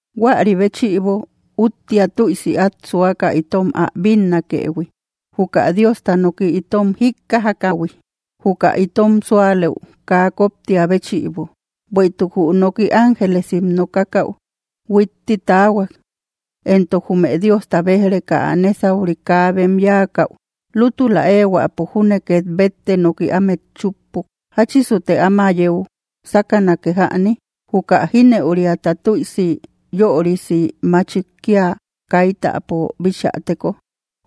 Huäri béchïbo, úttia tüisi át suaka itom ä bínnakëhui, juka Diosta noki itom jíkkajakähui, juka itom súalëu kaa koptiä béchïbo. Bueïtuk jü noki ángelesim nokakäu huitti taahuak; entok jume Diosta béj‑reka ä nésauri kaa bem yáakäu, lútula éehuäpo júne két bette noki ámet chúppuk. ¿Jáchisute áma yeu sákanake jäni? ¿Juka jínëuriata tüisi yörisi machik kía kaítäpo bichäteko?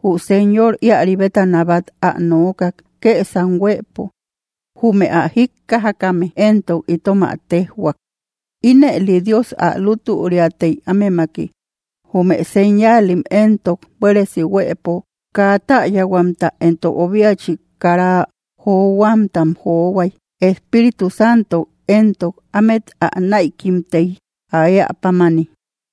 Jü Señor íäri bétana bát ä nookak, kësam huëpo; jume ä jíkkajakame éntok itom ä téjhuak. Ínëli Dios ä lútüriatey ámemaki. Jume señaalim entok buéresi huëpo kaa täyahuamta entok obiachik kara johuamtam johuay. Espíritu Santo éntok ámet ä näikimtey, ä éä pámani.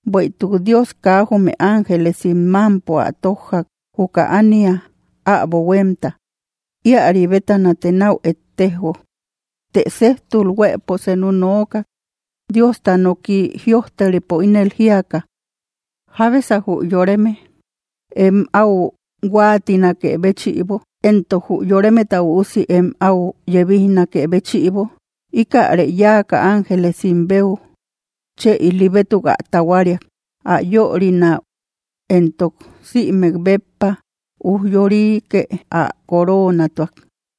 Bueïtuk Dios kaa jume ángelesim mámpo ä tójjak, juka ánia äbo huémta; íäri bétanate náu ettejo. Të séjtul huëpo senu nookak, Diosta noki jïojteripo ínel jíaka: ¿Jábesa jü yoreme em áu huáatinakë béchïbo, entok jü yoremeta üusi em áu yéebijnakë béchïbo? Íkäre yáaka ángelesim beu chë ili bétuk ä tahuariak. Ä yörinäu éntok sïmek béppa ujyorike ä coroonatuak.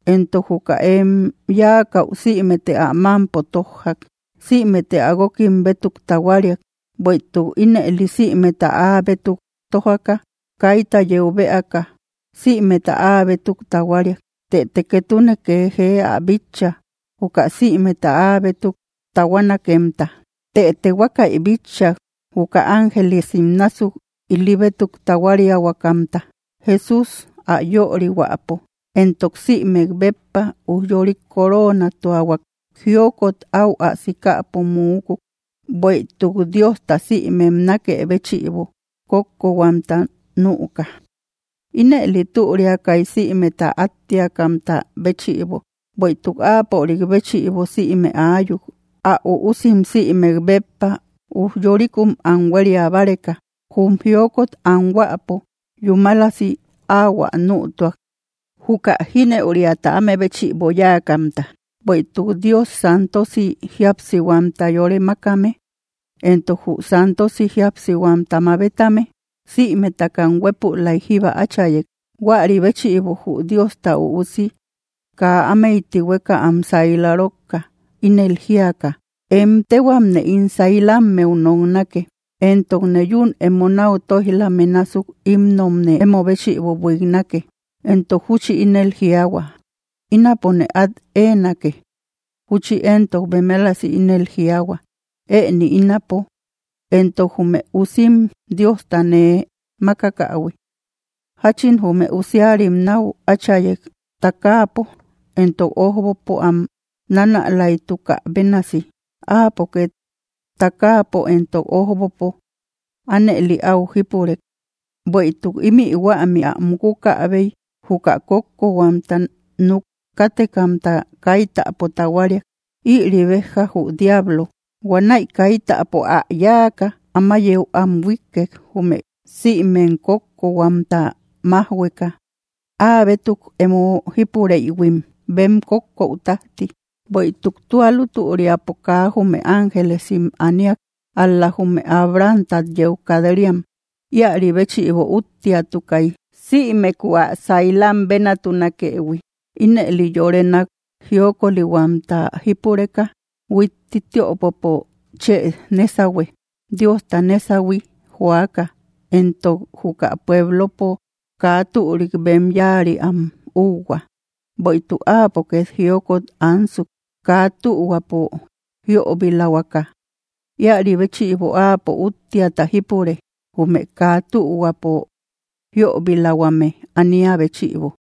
Éntoke juka em yáakäu sïmete ä mámpo tójjak. Sïmete ä guókim bétuk tahuariak. Bueïtuk ínëli sïmeta áa bétuk tójaka, kaita yeu bëaka, sïmeta áa bétuk tahuariak. Tëte ketune kee jee ä bitcha, juka sïmeta áa bétuk tahuanakemta. Tëte huákäi bitcha, juka ángelesim násuk ili bétuk tahuariahuakamta. Jesús ä yörihuäpo entok sïmek béppa ujyorik coroonatuahuak. Jiokot áu ä sikäpo muukuk, bueïtuk Diosta sïmem nákë béchïbo kókkohuamta nüka. Ínëli türiakay sïmeta áttiakamta béchïbo, bueïtuk áapörik béchïbo sïme aayuk. Ä üusim sïmek béppa ujyorikum am huéria báreka, jum jiokot anhuäpo yúmalasi ahuä nütuak, juka jínëuriata áme béchïbo yáakamta. Bueïtuk Dios santosi jíapsihuamta yore makame, entok jü santosi jíapsihuamta mabetame. Sïmetakam huepulaik jíba áchayek. Huäri béchïbo jü Diosta Üusi kaa ámey tihueka am saila rókka, ínel jíaka: Em téhuamne ín sailammeu noknake, entokne yún emo náu tóijlame násuk himnomne emo béchïbo buiknake. Entok júchi ínel jiaahua: Ínapone át éenake. Júchi éntok bemelasi ínel jiaahua: Ëni ínapo, entok jume usim Diosta nee mákakähui. Jachin jume usiarim náu áchayek takaapo entok ójbopo am nanälaytukä bénasi, áapo két takaapo entok ójbopo ánëli áu jípurek. Bueïtuk ímï huämi ä mukukäbey, juka kókkokhuamta núk kátekamta kaítäpo tahuariak. Ïri béja jü diablo. Huanäi kaítäpo am yáaka, áma yeu am huíkkek, jume sïmem kókkohuamta májhueka áa bétuk emo jípureïhuim, bem kókkou tájti. Bueïtuk tua lútüriapo kaa jume ángelesim aniak, ál‑la jume Abrahamtat yeu kat‑riam. Íäri béchïbo úttiatukay, sïmeku ä sailam bénatunakëhui. Ínëli yore nák jiokolihuamta jípureka huitti tiöpopo chë nésahue, Diosta nésahui joaka, entok juka pueblopo kaa türik bem yáari am úuhua. Bueïtuk áapo két jiokot ansuk, kaa tühuapo jíöbilahuaka. Íäri béchïbo áapo úttiata jípure, jume kaa tühuapo jíöbilahuame ania béchïbo.